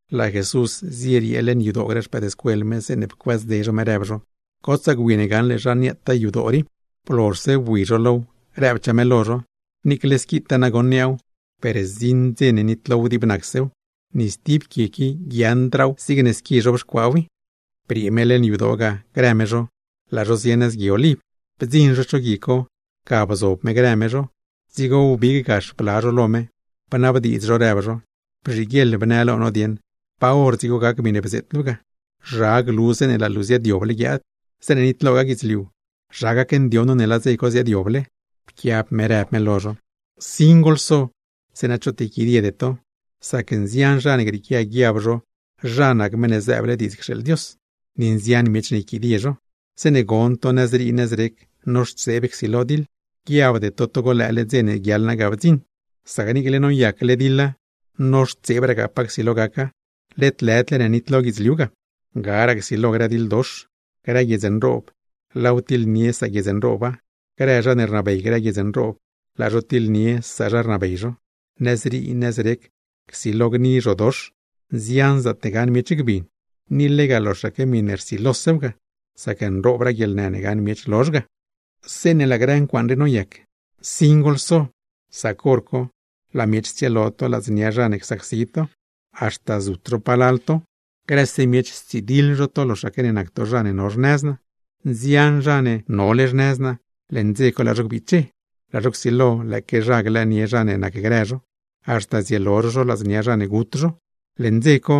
Laa Jesús zieriee leṉ yadoo grë xpëëdscuel me, zeeṉe pcuëëzdze zho me, rëb zho: ―Gotsaa gwi ne gaṉle zha niaataa yadoo rii. Blozhse bui zho low, rëbchaa me lo zho: ―Niicle squitaa nagoṉ niaaw, per zdziṉ dze ne nitlow dib nacsew. Ni stib quie qui guiaaṉdraa zigne squi zhobxcuaaw i. Briee me leṉ yadoo ga grë me zho, laa zho zie nëz Gui Oliv. Bdziṉ zho cho gui co, ga bzob me grë me zho. Dzigo wbig gax bla zho lo me, bnabdiidz zho rëb zho: ―Bzhiguieḻ bnë lo no dieṉ, ¿pa hor dzigo gac miṉe bzeet luu ga? ¿Zha glu zeeṉe laa luu ziaadyoble guiaad? Zeeṉe nitlogaa guidzliu, ¿zha gacndioṉ no laa dze co ziaadyoble? Pquiab me rëb me lo zho: ―Nsin goḻso, zeeṉa choot yquidiede to. Sac nzian zha ne grieequia guiab zho zha nac Meṉ ne zëëble diidz cxeeḻ Dios; ni nzian miech ne yquidie zho. Zeeṉe gon to nëzrii nëzrec noxtseeb csilo diḻ, guiabde to togo lëële dze ne guiaḻ naa ga bdziṉ; sac niicle noyacle diḻa, noxtseebragaa pa csilo gaca, led lëdle ne nitlo guidzliu ga. Garaa csilo grë diḻdox, grë guiedz nroob laaw tiḻnie saguiedz nrooba; grë zha ne rnabey grë guiedz nroob, laa zho tiḻnie sazha rnabey zho. Nëzrii nëzrec csilo gni grë zhodox, nzian zaatne gaṉ miech gbin. Ni lega loxaque miṉe rsilosew ga, sac nroobraa guieḻnë ne gaṉ miech lozh ga. ’Zeeṉe laa grë ncuaaṉ rii noyac, ¡nsin goḻso! Sac hor co laa miech tsielo to ladznia zha ne csacsi to, haxta zut zho palal to, grëse miech stsidiḻ zho to loxaque ne nac to zha ne no xnëz naa. Nzian zha ne nole xnëz naa, leṉ dze co laa zho gbiche, laa zho csilo lëëque zha glëënie zha ne nacgrë zho, haxta zielo zho zho ladznia zha ne gut zho. Leṉ dze co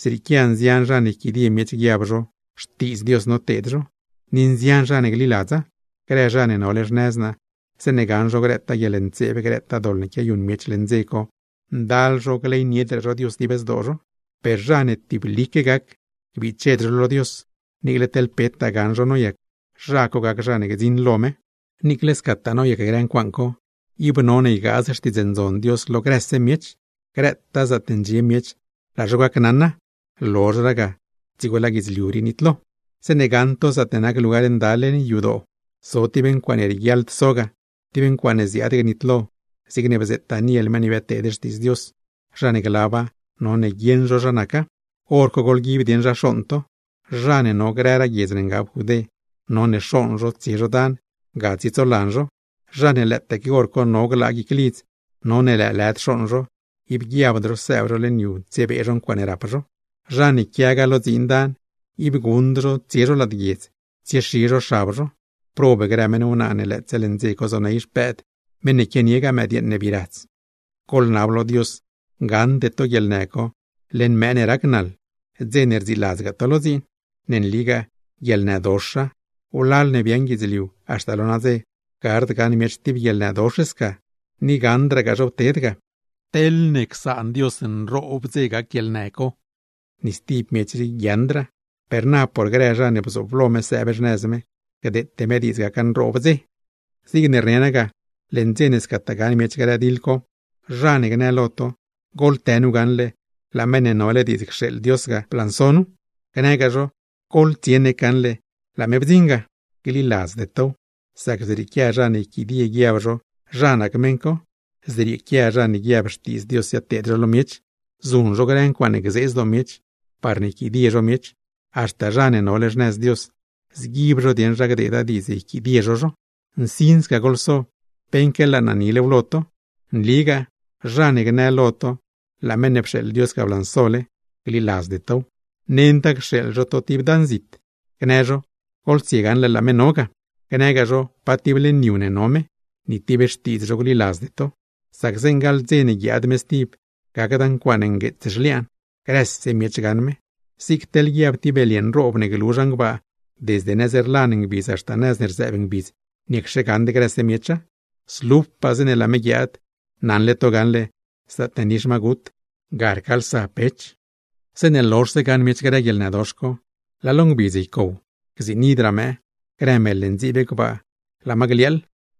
zrieequia nzian zha ne yquidie miech guiab zho xtiidz Dios noteed zho, ni nzian zha ne gliladza. Grë zha ne nole xnëz naa, zeeṉe gaṉ zho grëtaa guieḻntseeb, grëtaa doḻ ne quiayuṉ miech leṉ dze co, ndal zho gleyniedraa zho Dios dib zdoo zho. Per zha ne tiblique gac, gbiched zho lo Dios, niicle teḻ petaa gaṉ zho noyac, zha co gac zha ne gdziṉ lo me. Niicle scataa noyac grë ncuaaṉ co, ib none ygaaz Xtiidz Ndzon Dios lo grëse miech, grëtaa zaatne ndxie miech laa zho gacnaṉa; lozhraa ga dzigo laa guidzliu rii nitlo. ’Zeeṉe gaṉ to zaatne nac Lugar Nda leṉ yadoo, zo tib ncuaaṉe rieguiaḻd so ga, tib ncuaaṉe ziaad gnitlo, zigne bzeet Daniel meṉ ne biadteed xtiidz Dios (zha ne glaba, none guieṉ zho zha naca), hor co goḻguib dieṉ zha xooṉ to. Zha ne no grëraa guiedz ne ngab Judé, none xooṉ zho tsie zho dan, ga tsietsolan zho. Zha ne lëëtaque hor co no glaa guic lidz, none lëëlëd xooṉ zho, ib guiabd zho sëëb zho leṉ yu tsiebee zho ncuaaṉe rap zho. Zha ne quiagaa lo dziin dan, ib guṉd zho tsie zho lad guiedz tsiexi zho xab zho. ¡Prob grë meṉ wnaa ne lëëtse leṉ dze co zoney xpëëd, meṉ ne quianiegaa mëdyeeṉ ne bii radz! Goḻnab lo Dios gaṉde to guieḻnë co leṉ mëë ne rac naḻ, dze ne rdziiladzgaa to lo dziin. Ne nligaa guieḻnëdoxa. Wlal ne biaaṉ guidzliu haxta lo nadze, gard gaṉ miech tib guieḻnëdox sca, ni gaṉdragaa zhow ted ga. Teḻne csaan Dios nroob dze gac guieḻnë co, ni stib miech rii guiaaṉdraa; per na por grë zha ne bzooblo me sëëb xnëz me, gdeete me diidz gaca nroob dze. ’Zigne rne naa ga, leṉ dze ne scataa gaṉ miech grë diḻ co, zha ne gnë lo to: “Goḻtë nu gaṉle, lëë Meṉ ne nole cxeeḻ Dios ga blanso nu”, gnëgaa zho: “Goḻtsie nec gaṉle, laa me bdziṉ ga”, gliladzde tow. Sac zrieequia zha ne yquidie guiab zho zha nac meṉ co, zrieequia zha ne guiab xtiidz Dios ziadteed zho lo miech, zuṉ zho grë milagr nroob, parne yquidie zho miech, haxta zha ne nole xnëz Dios, zguib zho dieṉ zha gdeeda diidz yquidie zho zho. ¡Nsin sca goḻso! Beṉque laa naa nilew lo to. Nligaa zha ne gnë lo to laa meṉ ne pxeeḻ Dios ga blansole, gliladzde tow. Nenda cxeeḻ zho to tib dan zit, gnë zho: “Goḻtsie gaṉle laa me no ga”, gnëgaa zho pa tib leṉ yu ne no me, ni tib xtiidz zho gliladzde to. Sac zeeṉ gaḻ dze ne guiaad me stib, gacda ncuaaṉ ngueets zhliaan, grëse miech gaṉ me. Zig teḻ guiab tib belye nroob ne glu zhan gbaa, desde nëz ne rlan ngbidz haxta nëz ne rzëëb ngbidz, ¿niacxe gaṉd grëse miecha? Zlupaa zeeṉe laa me guiaad; naṉle to gaṉle zaatne nix ma gut, ga rcaalsa pech. ’Zeeṉe lozhse gaṉ miech grë guieḻnëdox co, laa lo ngbidz ycow, gziinidraa mëë. Grë mel ne ndziib gbaa, laa ma gliaaḻ;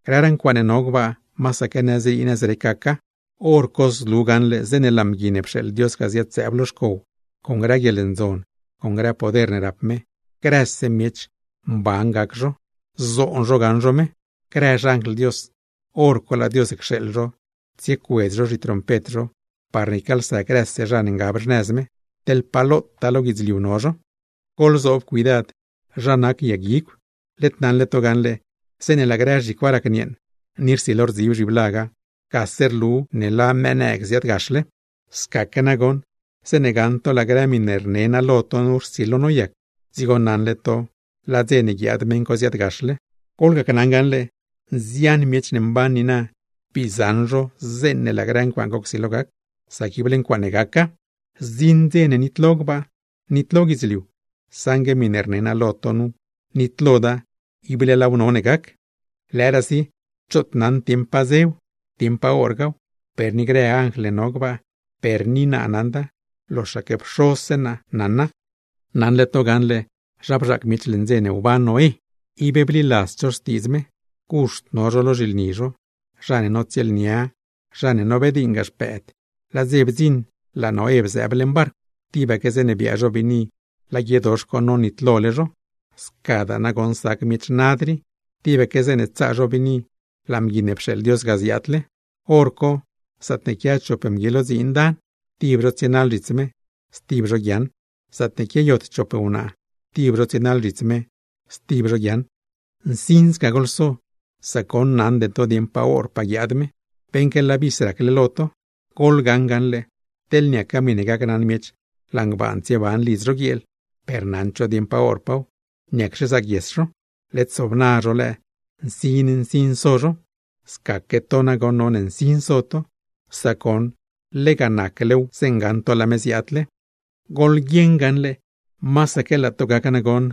grëraa ncuaaṉe no gbaa, masaque nëzrii nëzrec gaca. Horco zlu gaṉle zeeṉe laa Mgui ne pxeeḻ Dios ga, ziad-zëëb lo xcow con grë guieḻndzon, con grë poder ne rap me, grëse miech mban gac zho, zoon zho gaṉ zho me. Grë xanjl Dios, hor co laa Dios cxeeḻ zho tsiecuedz zho zhitrompet zho parne ycaalsa grëse zha ne ngab xnëz me, teḻ pa lotaa lo guidzliu no zho. ’Goḻzoob cuidad zha nac yag guigw. Led naṉle to gaṉle, zeeṉe laa grë zhicwa racnieeṉ, ni rsilo rdzib zhiblaga, gase rlu ne laa mëë nëëg ziaadgaxle. Scaque nagoṉ zeeṉe gaṉ to laa grë miṉe rne naa lo to nu rsilo noyac, dzigo naṉle to laa dze ne guiaad meṉ co ziaadgaxle. Gneli naa lo to gaṉle, nzian miech ne mban niina bii zaṉ zho zeeṉe laa grë ncuaaṉ co csilo gac; sac ible ncuaaṉe gaca. Zdziṉ dze ne nitlo gbaa, nitlo guidzliu, saṉgue miṉe rne naa lo to nu, nitloda; ible laaw none gac. ’Lëëraasi choot naṉd dieṉ pa dzew, dieṉ pa horgaaw, per ni grë anjl ne no gbaa, per ni naa naṉda, loxaque Pxozse naa naṉa. ’Naṉle to gaṉle zha bzhaac miech leṉ dze ne wban Noé, ib bliladzd zho xtiidz me. Guxt no zho lo zhilni zho, zha ne notsieelnia, zha ne nobediiṉgaa xpëëd, laa dze bdziṉ laa Noé bzëëb leṉ barcw; tibaque zeeṉe biaa zho biini laa guiedox co nonitlole zho. Scadaa nagoṉ sac grë miech nad rii, tibaque zeeṉe tsaa zho biini laa Mgui ne pxeeḻ Dios ga ziaadle. Horco zaatne quia chop mgui lo dziin dan; tib zho tsienaḻ zhits me, stib zho guiaaṉ. Zaatne quiayot chop wnaa, tib zho tsienaḻ zhits me, stib zho guiaaṉ. ’¡Nsin sca goḻso, sac goṉ naṉde to dieṉ pa horpaa guiaad me, beṉque laa vis racle lo to! Goḻgaṉ gaṉle, teḻ niaca miṉe gacnaṉ miech laa ngbaan tsieban lidz zho guieel, per naṉd zho dieṉ pa horpaaw; ¿niacxe zaaguies zho? Led sobna zho lëë, nsin nsin so zho. Scaque to nagoṉ, none nsin so to, sac goṉ lega naclew zeeṉ gaṉ to laa me ziaadle. ’Goḻgaṉ gaṉle, masaque laa to gac nagoṉ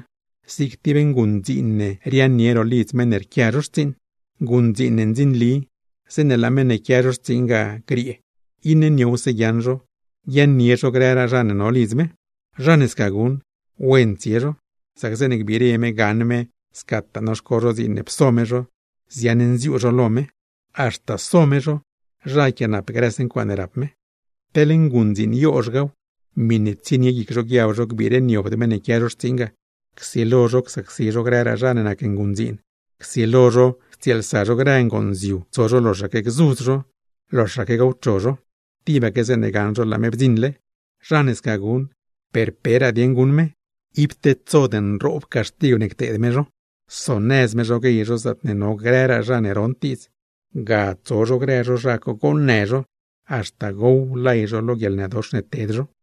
zig tib nguṉdziin ne riaaṉnie ro lidz meṉ ne rquia zho xtsiiṉ. ’Nguṉdziin ne ndzinli, zeeṉe laa meṉ ne quia zho xtsiiṉ ga griee, iṉe niowse guiaaṉ zho guiaaṉnie zho grëraa zha ne no lidz me. Zha ne sca guṉ, ¡wen tsie zho, sac zeeṉe gbire me gaṉ me scataa noxco zho dziin ne pso me zho, ziaṉnziuu zho lo me haxta so me zho, zha yquiaanap grëse ncuaaṉe rap me! ’Teḻ nguṉdziin yozhgaaw, miṉe tsienie guic zho guiab zho gbireniobd meṉ ne quia zho xtsiiṉ ga, csilo zho csacsi zho grëraa zha ne nac nguṉdziin, csilo zho ctsieelsa zho grë ngonziu tso zho loxaque gzudz zho, loxaque gowcho zho, tibaque zeeṉe gaṉ zho laa me bdziṉle. Zha ne sca guṉ, per peraa dieṉ guṉ me, ib tedsod nroob caxtigw ne cteed me zho, sonëz me zho guey zho zaatne no grëraa zha ne rond diidz, ga tso zho grë zho zha co goonnë zho, haxta gow lay zho lo guieḻnëdox ne ted zho.